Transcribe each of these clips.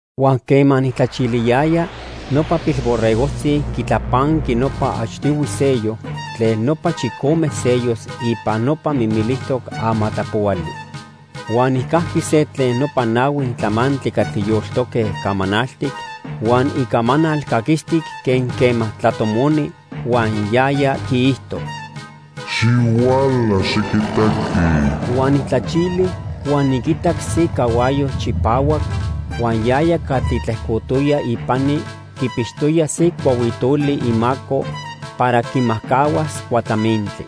Huan quema nijtlachiliyaya, nopa Pilborregojtzi quitlapanqui nopa achtihui sello tlen nopa chicome sellos ipan nopa mimilijtoc amatlapohuali. Huan nijcajqui se tlen nopa nahui tlamantli catli yoltoque camanaltic huan icamanal caquistic quen quema tlatomoni, huan yaya quiijto: "¡Xihuala, xiquitaqui!" Huan nijtlachili huan niquitac se cahuayo chipahuac, huan yaya catli tlejcotoya ipani quipixtoya se cuahuitoli imaco para quimajcahuas cuatlamintli.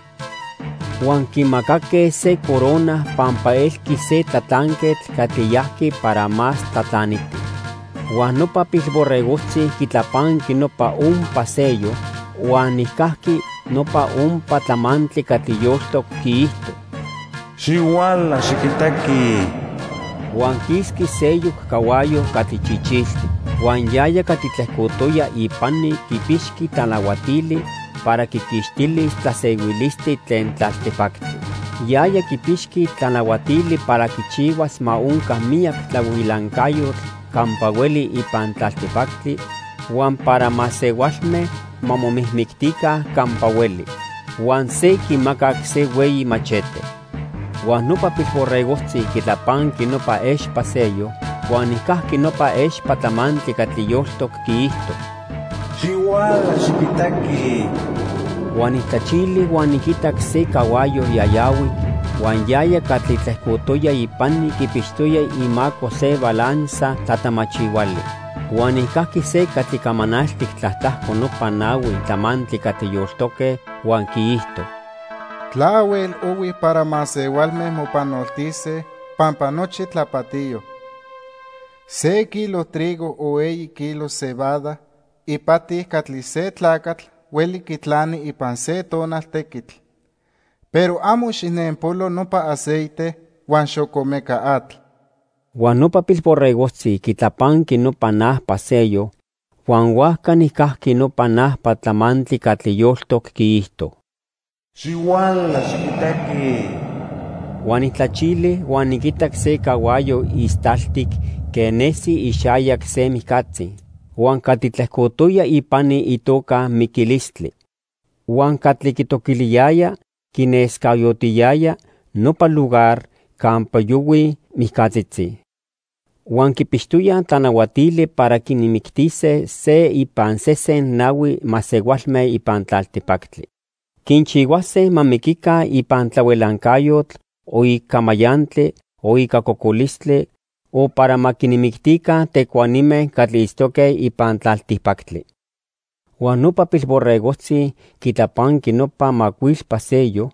Huan quimacaque se corona pampa elqui se tlatlanquetl catli yajqui para más tlatlaniti. Huan nopa Pilborregojtzi quitlapanqui nopa ompa sello, huan nijcajqui nopa ompa tlamantli catli yoltoc quiijto: "¡Xihuala, xiquitaqui!" Huan quisqui seyoc cahuayo catli chichiltic. Huan yaya catli tlejcotoya ipani quipixqui tlanahuatili para quiquixtilis tlasehuilistli tlen tlaltipactli. Yaya quipixqui tlanahuatili para quichihuas ma onca miyac tlahuilancayotl campa hueli ipan tlaltipactli huan para masehualme ma momijmictica campa hueli. Huan se quimacac se hueyi machete. Huan nopa Pilborregojtzi quitlapanqui nopa expa sello, huan nijcajqui nopa expa tlamantli catli yoltoc quiijto: "¡Xihuala, xiquitaqui!" Huan nijtlachili huan niquitac se cahuayo yayahuic, huan yaya catli tlejcotoya ipani quipixtoya imaco se balanza tlatamachihuali. Huan nijcajqui se catli camanaltic tlatlajco nopa nahui tlamantli catli yoltoque, huan quiijto: "Tlahuel ohui para masehualme mopanoltise pampa nochi tlapatiyo. Se kilo trigo o eyi kilos cebada ipati catli se tlacatl hueli quitlani ipan se tonal tequitl, pero amo xijnenpolo nopa aceite huan xocomeca atl." Huan nopa Pilborregojtzi quitlapanqui nopa najpa sello, huan huajca nijcajqui nopa najpa tlamantli catli yoltoc quiijto: "¡Xihuala, xiquitaqui!" Huan nijtlachili huan niquitac se cahuayo istaltic quen nesi ixayac se mijcatzi. Huan catli tlejcotoya ipani itoca Miquilistli. Huan catli quitoquiliyaya quinescayotiyaya nopa lugar campa yohuij mijcatzitzi. Huan quipixtoyaj tlanahuatili para quinmictise se ipan sesen nahui masehualme ipan tlaltipactli. Quinchihuase ma miquica ipan tlahuilancayotl, o ica mayantli, o ica cocolistli, o para ma quinmictica tecuanime catli itztoque ipan tlaltipactli. Huan nopa Pilborregojtzi quitlapanqui nopa macuilpa sello,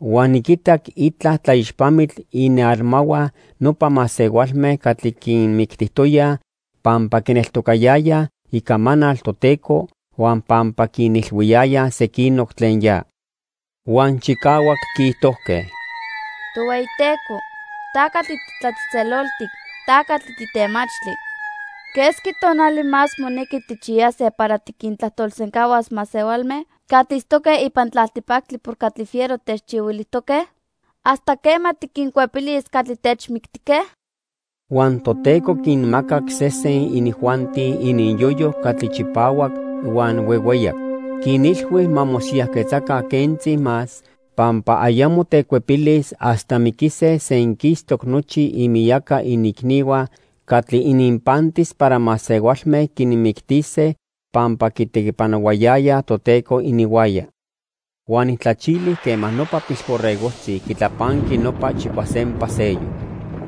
huan niquitac itla tlaixpamitl inialmahua nopa masehualme catli quinmictijtoyaj pampa quineltocayayaj icamanal Toteco huan pampa quinilhuiyayaj sequinoc tlen ya. Huan chicahuac quiijtojque: "Tohueyiteco, ta catli titlatzejtzeloltic. Ta catli titemachtli. ¿Quesqui tonali más monequi tijchiyase para tiquintlajtolsencahuas masehualme catli itztoque ipan tlaltipactli por catli fiero techchihuilijtoque? ¿Hasta quema tiquincuepilis catli techmictijque?" Huan Toteco quinmacac sesen inijuanti ininyoyo catli chipahuac huan huehueyac. Quinilhui ma mosiyajquetzaca quentzi más pampa ayamo tecuepilis hasta miquise senquistoc nochi imiyaca iniicnihua catli ininpantis para masehualme quinmictise pampa quitequipanohuayayaj Toteco ininhuaya. Huan nijtlachili quema nopa Pilborregojtzi quitlapanqui nopa chicuasempa sello.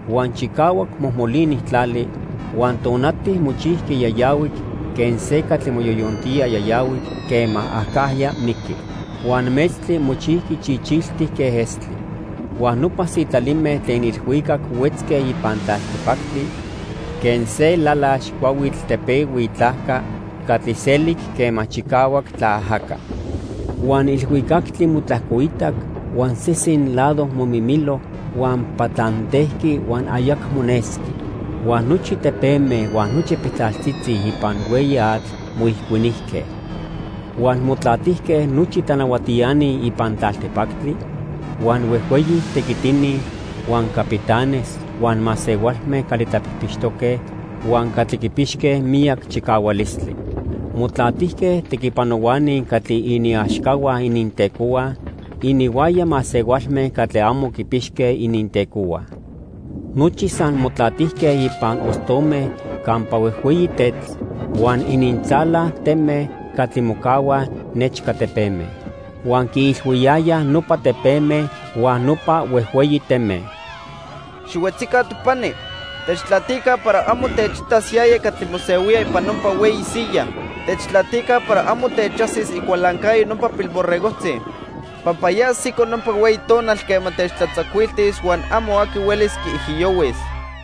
Huan chicahuac mojmolini tlali, huan tonati mochijqui yayahuic quen se catli moyoyontía yayahuic quema acajya miqui. Huan metztli mochijqui chichiltic quen estli. Huan nopa sitlalime tlen ilhuicac huetzque ipan tlaltipactli quen se lalax cuahuitl tepehui itlajca catli selic quema chicahuac tlaajaca. Huan ilhuicactli motlajcoitac huan sesen lado momimilo huan patlantejqui huan ayacmo nesqui. Huan nochi tepeme huan nochi piltlaltzitzi ipan hueyi atl moijicuinijque. Huan motlatijque nochi tlanahuatiani ipan tlaltipactli, huan huejhueyi tequitini, huan capitanes, huan masehualme catli tlapijpixtoque, huan catli quipixque miyac chicahualistli. Motlatijque tequipanohuani catli iniaxcahua inintecohua, ininhuaya masehualme catli amo quipixque inintecohua. Nochi san motlatijque ipan ostome campa huejhueyi tetl huan inintzala teme catli mocahuaj nechca tepeme. Huan quiilhuiyayaj nopa tepeme huan nopa huejhueyi teme: "Xihuetzica topani. Techtlatica para amo techitas yaya catli mosehuía ipan nopa hueyi siyaj. Techtlatica para amo techajsis icualancayo nopa Pilborregojtzi. Pampa ya ajsico nopa hueyi tonal quema techtlatzacuiltis huan amo aqui huelis quiijiyohuis."